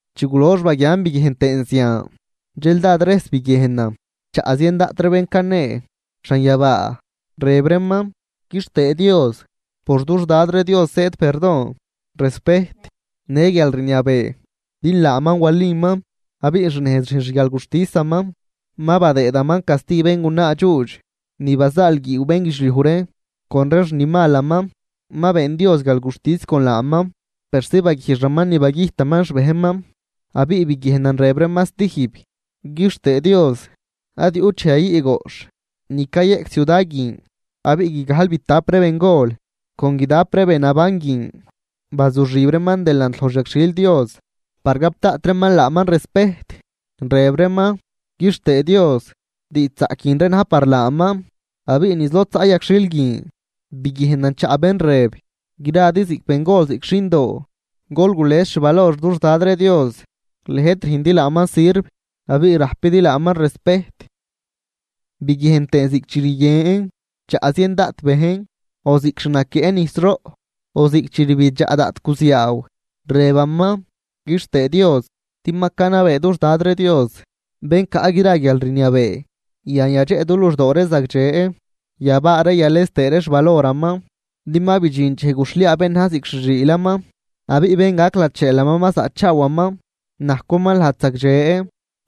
Chi gulox baguian biguiejn tëën zian, dxel dád rejs biguiejnan chaꞌ zien daꞌt ree bén canee xanyabaa rëb reeman: ¡Quixtëë Dios! Por dux Dad ree Dios zëëd perdon, respejt në guialrniabee, din laaman waliman abiꞌ xnejz rüjn xguialguxtisaman, ma badëëdaman casti béngunaa dxuudx ni bazaalguiiw bénguidxliuj ree con ree xni malaman, ma been Dios guialguxtis con laaman persi baguijxaman ni bagüjtaman xbejnman. Abiꞌ biguiejnan rëb reeman stijb: ―¡Quixtëë Dios! Ad yuꞌt dxej yayüꞌ goꞌxh ni cayeꞌc ciuda guin. Abiꞌ guigajlbitap ree bengol con guidap ree be naban guin bazuxib reeman delant loj xyagxhil Dios par gap daꞌt reeman laaman respejt, rëb reeman: ―¡Quixtëë Dios! ¡Diidxzaꞌc guin ree na̱j par laaman! Abiꞌ niz lod zaꞌ yagxhil guin biguiejnan chaꞌ bén rëb: Gradi ziꞌc bengol ziꞌc xindoo gol gules xvalor dux Dad ree Dios, lëjt rüjndi laaman sirv abiꞌ rajpidi laaman respejt. Biguiejn tëën ziꞌc chi rguien chaꞌ zien daꞌt bejn, o ziꞌc xnaquieꞌ nijsroꞌ, o ziꞌc chi rbidxaꞌ daꞌt guziaaw, rebaman: ¡Quixtëë Dios! Din ma canabee dux Dad ree Dios, bén caꞌ gra guialrniabee. Yan yadxeꞌ du luxdoo ree zagdxe, yabaa ree yales tëë ree xvaloraman. Din ma bidxin dxej guxhliaa bén na̱j ziꞌc xi xiilaman abiꞌ bén gac lacheelaman ma zaꞌchaawaman. Najcwaman lajd zagdxe,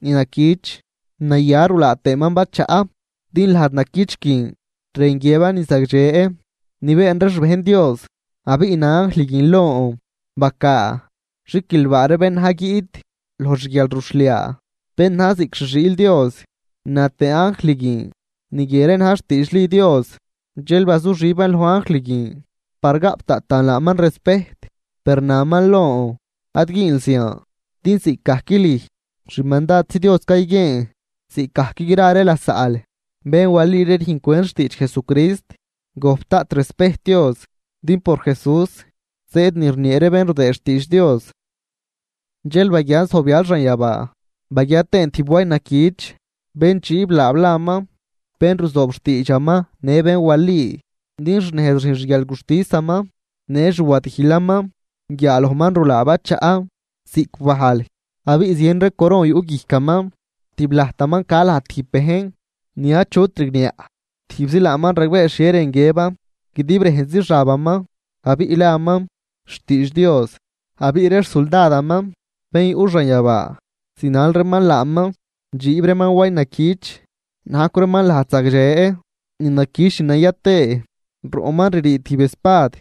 ni naquich, naya rulaa tëën bachaꞌ. Din lajd naquich guin rën guiëban ni zagdxe ni been ree xbejn Dios. Abiꞌ na anjl guin lon: ―Bacaa: “Xiquilbaa ree bén na̱j guiꞌt loj xguialruxhliaa bén na̱j ziꞌc xi xiil Dios.” Na tëë anjl guin: ―Ni guie ree na̱j xtiidxli Dios. Dxel bazuxiban loj anjl guin par gaꞌp daꞌtan laaman respejt, per naman lon: ―Ad güünl zian. Din ziꞌcgajc lüj xmandadzi Dios cayguieen, ziꞌcgajc gra ree lasaꞌl bén wali ree rüjncwent xtiidx Jesucrist. Gojp daꞌt respejt Dios. Din por Jesús zëëd ni rniee ree bén rudëëd xtiidx Dios. Dxel baguian zojbyal xanyabaa baguia tëën tijb way naquich. Bén dxiib laab laman: Bén ruzoob xtiidxaman në bén wali, din xnejz rüjn xguialguxtisaman në xwadijlaman, guiaalojman rulaan bachaꞌ ziꞌc bajl abiꞌ zien ree coron yuꞌ guijcaman, tib lajtaman ca laj tijb bejn ni achut rigniaꞌ, tijbzi laaman ragbee xhie rën guiëban, guidib rejnzi xabaman, abiꞌ laman Xtiidx Dios. Abiꞌ ree xsuldadaman bén yuꞌ xanyabaa zinal reeman laaman dxiib reeman way naquich, najcw reeman lajd zagdxe ni naquich ni naya tëë. Roꞌman ririi tijb espad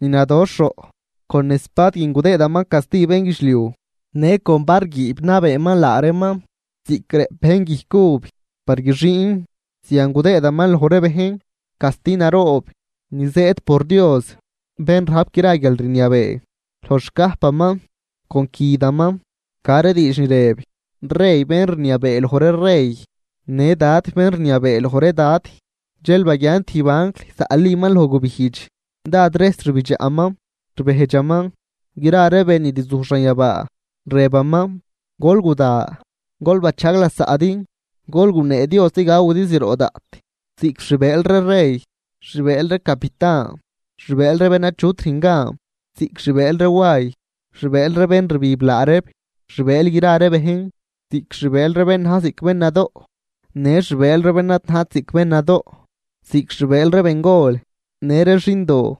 ni nadoxh roꞌ, con espad guin gudëëdaman casti bénguidxliuj, në con var guiib nabeeman laa reeman. Ziꞌc rëꞌp bejn guijc uv par guixiin, zian gudëëdaman loj reeman casti naroob ni zëëd por Dios bén rajp gra guialrniabee. Loj xcajpaman con cüdaman ca ree diidx ni rëb: “Rey bén rniabee loj ree rey në Dad bén rniabee loj ree dad.” Dxel baguian tijb anjl zaꞌliman loj gubijdx, dád rejs rbidxaꞌman, rbejdxaman gra ree be ni rzuj xanyabaa, rëbaman: ―Gol guda, gol bachajg lasaꞌdi lod gunee Dios ni gawidi zroꞌ daꞌt, ziꞌc xbëël ree rey, xbëël ree capitan, xbëël ree bén achut rüjn gan, ziꞌc xbëël ree way, xbëël ree bén rbib laa reeb, xbëël gra ree bejn, ziꞌc xbëël ree bén na̱j ziꞌc bén nadoꞌ në xbëël ree bén ad najt ziꞌc bén nadoꞌ, ziꞌc xi bëël ree bengol në ree xindoo.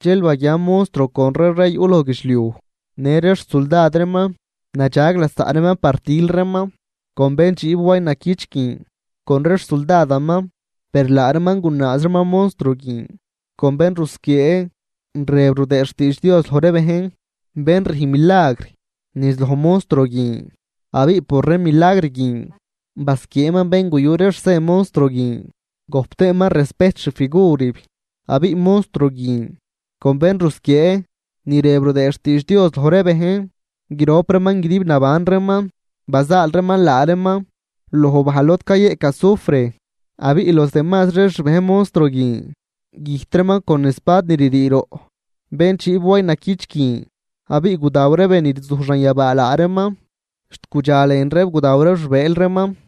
Dxel baguian monstruo con ree rey yuꞌ loj guidxliuj në ree xsuldad reeman, nadxag lasaꞌ reeman par til reeman con bén dxiib way naquich guin con ree xsuldadaman. Per laa reeman gunaaz reeman monstruo guin con bén rusquiee rëb rudëë xtiidx Dios loj ree bejn, bén rüjn milagr niz loj monstruo guin. Abiꞌ por ree milagr guin basquieeman bén guyu ree xsen monstruo guin gojp tëë reeman respejt xfigurib. Abiꞌ monstruo guin con bén rusquiee ni rëb rudëë xtiidx Dios loj ree bejn, grop reeman guidib naban reeman bazaal reeman laa reeman loj bajl lod cayeꞌc azufre. Abiꞌ los demazri ree xbejn monstruo guin güjt reeman con espad ni ririi roꞌ bén dxiib way naquich guin, abiꞌ gudaw ree be ni rzuj xanyabaa laa reeman, xt gudxa lën reeb gudaw ree xbëël reeman.